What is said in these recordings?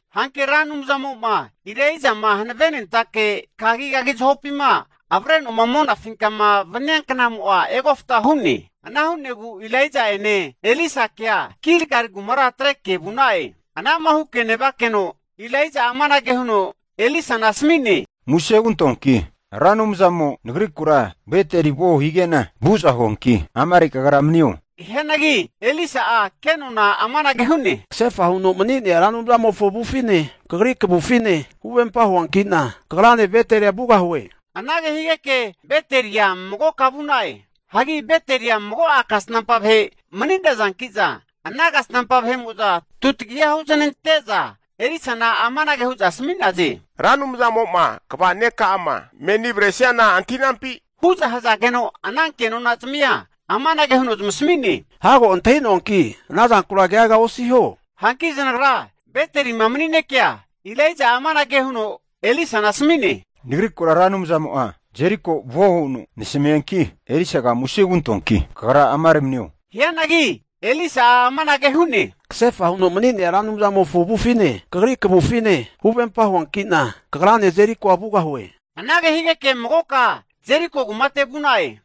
Hanki Ra Anumzamo'ma Elaijama hanavenentake kagigagi zahopima avreno'ma monafinkama vania knamo'a egofta hu'ne. Ana hu'negu Elaija'ene Elisakea Gilgali kumara atreke vu'na'e. Anama huke nevakeno Elaija'a amanage huno Elisana asmi'ne, Muse hugantoanki, Ra Anumzamo nagrikura Beteli vuo hige'na vu'za huanki amare kagra manio. Hianagi Elisa'a ke nona'a amanage hu'ne, Kasefa huno mani'nea Ra Anumzamofo avufine, kagri kavufine huvempa huanki'na, kagrane Betelia vugahue. Anage higeke Betelia magoka vu'na'e. Hanki Betelia mago'a kasnampa vahe mani'nazanki'za, ana kasnampa vahe'mo'za tutagiha huznante'za Elisana amanage hu'za asmi'naze, Ra Anumzamo'ma kva neka'ama menima avaresiana antahi'nampi? Hu'za hazageno ananke nonazmia amanage huno zamasami'ne, Hago antahi'noanki ana zankura keaga osiho. Hanki zanagra Betelima mani'nekea Elaija'a amanage huno Elisana asmi'ne, Nagrikura Ra Anumzamo'a Jeriko vuo huno nasamianki', Elisaga muse hugantoanki kagra amare manio. Hianagi Elisa'a amanage hu'ne, kasefa huno mani'nea Ra Anumzamofo avufine, kagri kavufine huvempa huanki'na, kagrane Jerikoa vugahue. Anage higeke magoka Jeriko kumate vu'na'e.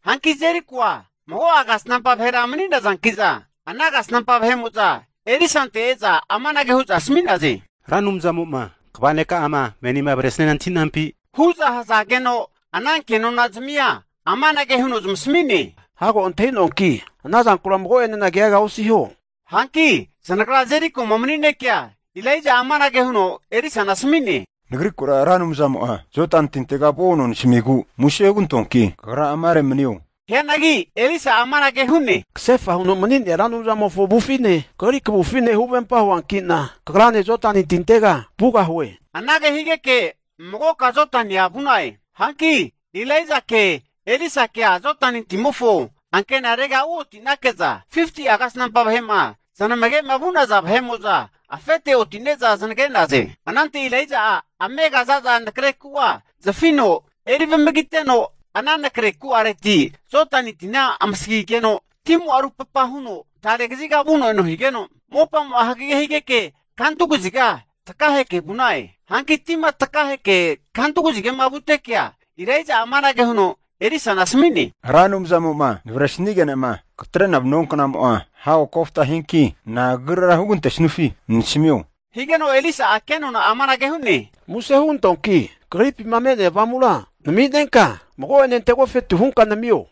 Hanki Jerikoa mago'a kasnampa vahera mani'nazanki'za, ana kasnampa vahe'mo'za Elisante e'za amanage hu'za asmi'naze, Ra Anumzamo'ma kva neka'ama menima avresiana antahi'nampi, hu'za hazageno ana kenonazmia amanage huno zamasami'ne, Hago antahi'noanki ana zankura mago'ene keaga osiho. Hanki zanagra Jerikoma mani'nekea Elaija'a amanage huno Elisana asmi'ne, Nagrikura Ra Anumzamo'a Jodani tintega vuo huno nasamigu, muse hugantoanki kagra amare manio. Hianagi Elisa'a amanage hu'ne, Kasefa huno mani'nea Ra Anumzamofo avufine, kagri kavufine huvempa huanki'na kagrane Jodani tintega vugahue. Anage higeke magoka Jodania vu'na'e. Hanki Elaijake Elisakea Jodani timofo ankenare uoti'nake'za, 50'a kasnampa vahe'ma zanamage vu'naza vahe'mo'za afete oti'ne'za zanage'naze. Anante Elaija'a amega antani'nea za'za nagreku'a zafino eri vamagiteno, ana nakre ku'areti Jodani tina amasagigeno, timo'a rupapa huno tare kaziga vuno eno higeno, mopamo'a hagage higeke, kantu kaziga takaheke vu'na'e. Hanki tima takaheke kantu kazigama vutekea, Elaija'a amanage huno Elisana asami'ne, Ra Anumzamo'ma navresnige'nama katre'na vanua knamo'a hago kofta hianki, na'a kagrira hugantesufi nasamio, higeno Elisa'a kenona'a amanage hu'ne, Muse hugantoanki kagripima me'nea avamura nami'nenka, mago'ene ante agofetu hunka namio.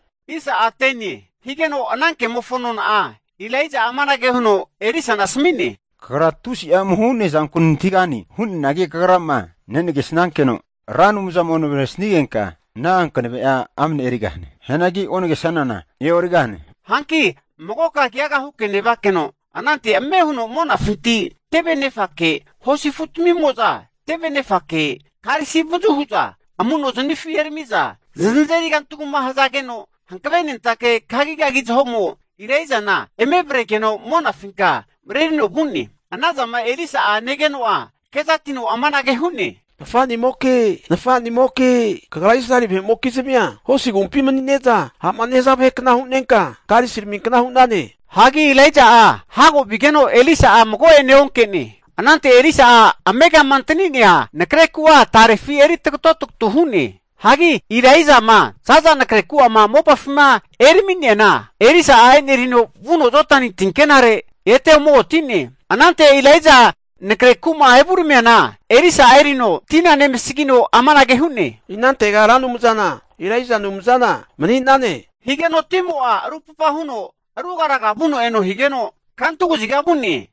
Higeno ana kemofo nona'a Elaija'a amanage huno Elisana asmi'ne, Kagra tusi'a amuho hu'nea zanku nantahigane, hu'neanagi kagrama nenagesankeno Ra Anumzamo'ma navresigenka ana hanave'a amne erighane. Hianagi onagesanana e'origahane. Hanki magoka keaga huke nevakeno, anante ame huno monafinti tevenefake hosi afutamimo'za tevenefake karisi avazu hu'za amu'nozanifi erami'za zanazeri kantugama hazageno, hankave nentake kagigagi zahomo Elaijana eme avregeno monafinka marerino vu'ne. Anazama Elisa'a negeno'a kezatino amanage hu'ne, Nafanimoke, nafanimoke, kagra Israeli vahe'mokizmia hosi agumpi manine'za ha'ma nehaza vahekna hunenka karisiraminkna hu'nane. Hagi Elaija'a hago vigeno Elisa'a mago'ene onke'ne. Anante Elisa'a amegama antani'nea nakre ku'a tarefi eri tagato tagatu hu'ne. Hagi Elaijama zaza nakre ku'amo'ma mopafima erami'neana, Elisa'a e'nerino vuno Jodani tinkenare ete ome oti'ne. Anante Elaija nakre kuma mopafima evuramiana Elisa'a erino tina nemasagino amanage hu'ne, inantega Ra Anumzana, Elaija Anumzana mani'ne, higeno timo'a rupapa huno rugaraga vuno eno higeno, kantu kaziga vu'ne.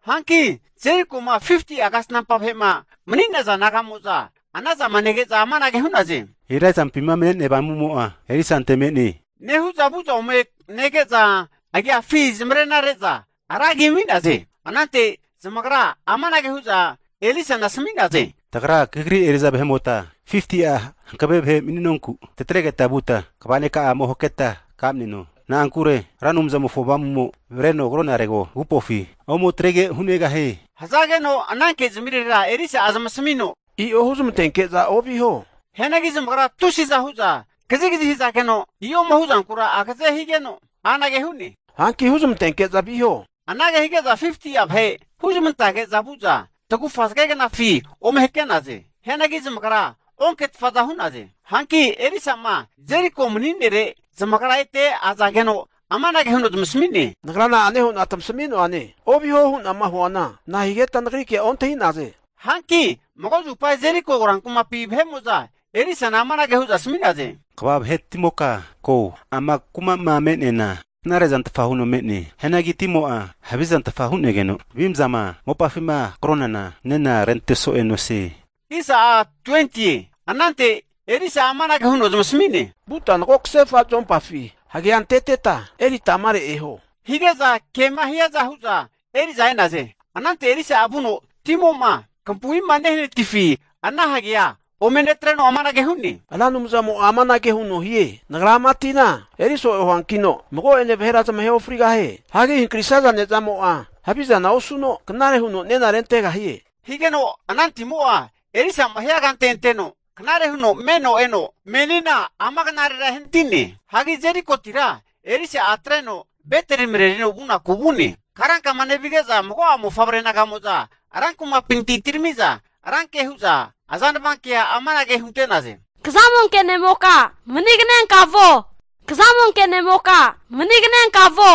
Hanki Jerikoma 50'a kasnampa vahe'ma mani'naza naga'mo'za anazama nege'za amanage hu'naze, Elaijampima me'nea avamumo'a Elisante me'ne, nehu'za vu'za ome nege'za, agiafi zamarena re'za ra agi amiza hu'naze. Anante zamagra amanage hu'za Elisana asami'naze, tagra Kagri eri'za vahe'mota 50'a hankave vahe mani'nonku tatregeta vuta kva neka'agura ome haketa kamneno. Na'ankure Ra Anumzamofo avamu'mo avreno agonarego, agupofi ome atrege hunegahie. Hazageno ana kezamirera Elisa'a zamasamino, i'o huzamantenke'za oviho. Hianagi zamagra tusi'za hu'za kazigazi hazageno, i'oma huzankura agaze higeno anage hu'ne, hanki huzamantenke'za viho. Anage hige'za 50'a vahe huzmantage'za vu'za tagufa zage knafi ome hake'naze. Hianagi zamagra onketfa hu'naze. Hanki Elisa'ma Jeriko mani'nere zamagra ete azageno, amanage huno zamasami'ne, nagra na'ane hu'na tamasamuane, oviho hu'nama huana nahigeta nagri kea ontahi'naze? Hanki mago zupa Jeriko rankumapi vahe'mo'za Elisana amanage hu'za asmi'naze, kva vahe'timoka ko, ama kuma'ma me'neana knare zantfa huno me'ne. Hianagi timo'a havizantfa hu'negeno, avimzama mopafima hankronana nena rente so'ea nosie. Anante Elisa'a amanage huno zamasami'ne, vuta mago kasefa zuompafi hagea anteteta erita amare eho. Hige'za kema hiaza hu'za eri'za e'naze. Anante Elisa'a vuno timo'ma kampu'ima nehanatifi ana hagea ome netreno amanage hu'ne, Ra Anumzamo'a amanage huno hie, Nagra ama tina eri so'e huankino mago'ene vahera zamahe ofrigahie. Hagi hankrisaza ne'zamo'a havizana osuno, knare huno nena rentegahie. Higeno ana timo'a Elisa'ma hiankante anteno, knare huno meno eno, menina ama knarera ehanati'ne. Hagi Jerikotira Elisa'a atreno Beteli marerino vu'naku vu'ne. Karankama nevige'za mago'a mofavre naga'mo'za ran kumapinti atirami'za ranke hu'za azanvankea amanage hunte'naze, Kazamonke ne'moka maniganenka vuo, kazamonke ne'moka maniganenka vuo.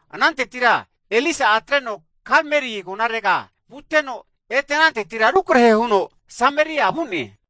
Anantetira Elisa'a atreno Karmeli agonarega vuteno, ete anantetira rukrahe huno Sameria vu'ne.